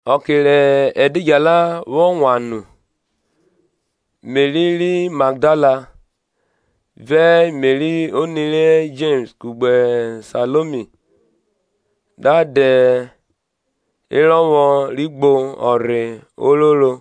Ọke rẹ ẹdidjala vwọ wan nu, Meri ri Magdala, vẹ Meri oni ri Jems kugbe Saiomi, da dẹ erọvwọ ri gbo ọnrhe ororo,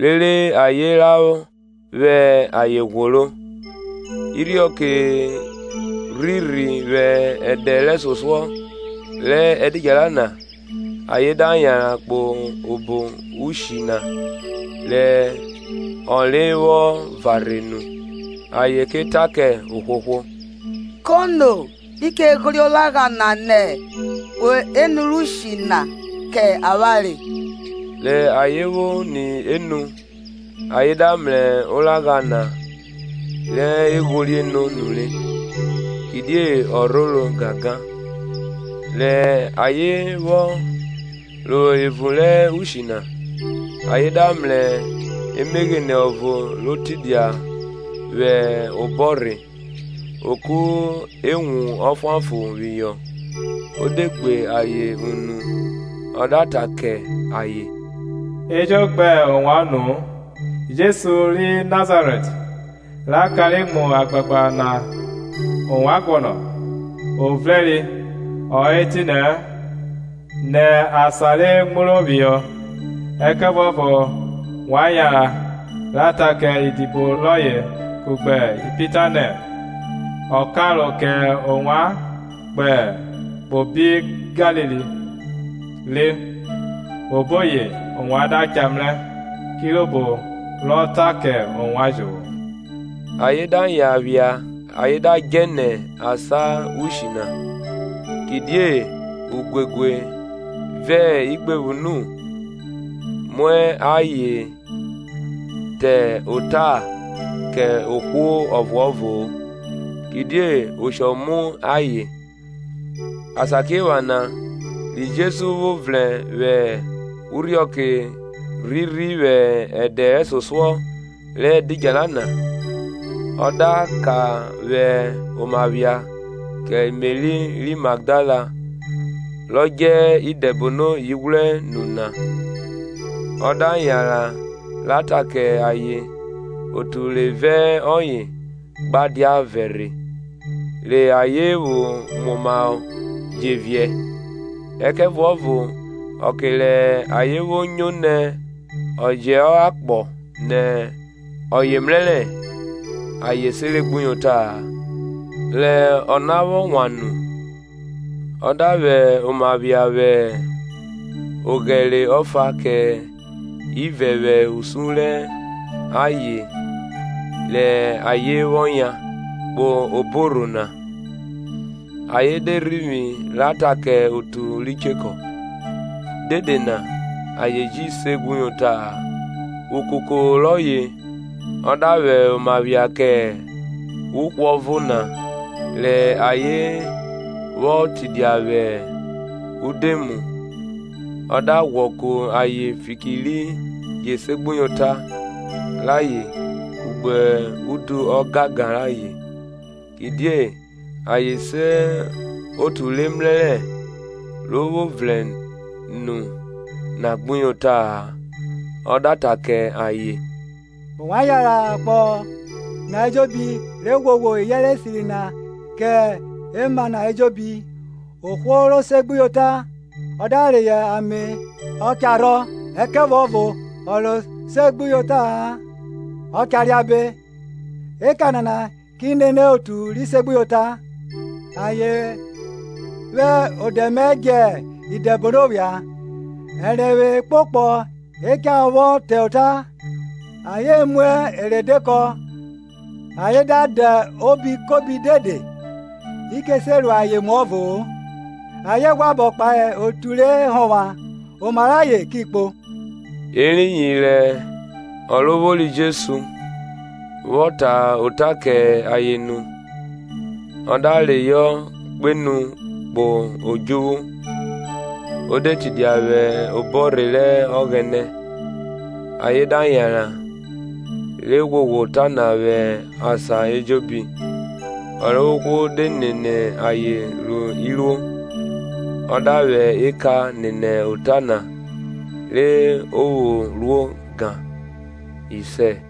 rere ayen ra vwẹ ayen ghworo. Irhiọke rhirhi vwẹ ẹdẹ rẹsosuọ rẹ ẹdidjala na ayen da yanran kpo obo ushi na rẹ ọnre vwọ varhe nu. Ayen ke ta kẹ ohwohwo, Kono ri che ghorie oragha na nẹ unu rẹ ushi na kẹ avwanre? Rẹ ayen vwo ni enu ayen da mrẹ oragha na re e ghorie no nure. kidie ọ rhoro gangan. Rẹ ayen vwọ ro evun rẹ ushi na, ayen da mrẹ emeghene ọvo ro tidia vwẹ obọrhe, o ku ewun ọfuanfọn phihọ; o de gbe ayen unu. Ọ da ta kẹ ayen, E jo gbe ovwan unu-u Jesu ri Nazarẹt, ra kanre mu agbagba na ovwan guọnọ. O vrẹnre ọ hẹ etinẹ-ẹ. ni asan re muro phihọ! Ẹkẹvuọvo wa yanran, ra ta kẹ idibo rọye kugbe Pita nẹ, Ọ karo kẹ ovwan kpo obi Galili re. oboyi ovwan da cha mrẹ, kirobo rọ ta kẹ ovwan jovwo. Ayen da yan phia ayen da djẹ nẹ asan ushi na; kidie uguegue ve igbevwunu mu ayen, ayen ta ota kẹ ohwo ọvuọvo-o; kidie oshọ mu ayen. Asakiephana ri Jesu vwo vrẹn vwẹ urhiọke rhirhi vwẹ ẹdẹ rẹsosuọ rẹ ẹdidjala na; ọ da ka vwẹ oma phia ke Meri ri Magdala rọ djẹ idẹbono ighwrẹ nu na. Ọ da yanran ra ta kẹ ayen otu re vẹ ọye gba dia vẹrhe, rẹ ayen vwo muomahọ je viẹ. Ẹkẹvuọvo ọke rẹ ayen vwo nyo nẹ ọ jẹ hẹ akpọ nẹ ọye mrẹrẹ, ayen seregbuyota-a. Re ọna vwo wan nu. Ọ da vwẹ oma phia vwẹ oghẹre ọfa kẹ ivẹ vwẹ usun rẹ ayen rẹ ayen vwọ yan, kpo obo orho na. Ayen de rhivwi ra ta kẹ otu ri chekọ. dede na ayen ji segbuyota-a. Ukuko rọye ọ da vwẹ oma phia kẹ uhwọvo na rẹ ayen vwo tidia vwẹ udoemu; ọ da ghwọ ku ayen fiki ri jesegbuyota rayen kugbe udu ọgangan rayen, kidie ayen se otu re mrẹrẹ ro vwo vrẹn nu na gbuyota-a. Ọ da ta kẹ ayen, Ovwan yanran ro akpọ na ejobi, re ghwoghwo iyẹnrẹ esiri na ke ema na ejobi. Ohwo ro seregbuyota ọ da reyọ ame ọ cha rhọ; ẹkẹvuọvo ọ ro seregbuyota-a cha reabe. Eka nana ki nene otu ri segbuyota. ayen vwẹ odẹ mẹ djẹ idẹbono phia; ẹrenvwe ekpokpọ e cha vwọ ta ota; ayen mu eredekọ, ayen da da obi kobi dede, i che se ru ayen emu ọvo-o; ayen ghwẹ abọ kpahe otu re hovwan, oma rẹ ayen ki kpo. Eriyin rẹ Ọrovwori Jesu, vwọ ta ota kẹ ayen nu, a da reyọ kpenu kpo odjuvwu, o de tidia vwẹ obọrhe rẹ Ọghẹnẹ. Ayen da yanran, re ghwoghwo ota na vwẹ asan ejobi, Ọrovwohwo de nene ayen ru iruo, ọ da vwẹ eka nene ota na re o vwo ruo gan. Isẹ.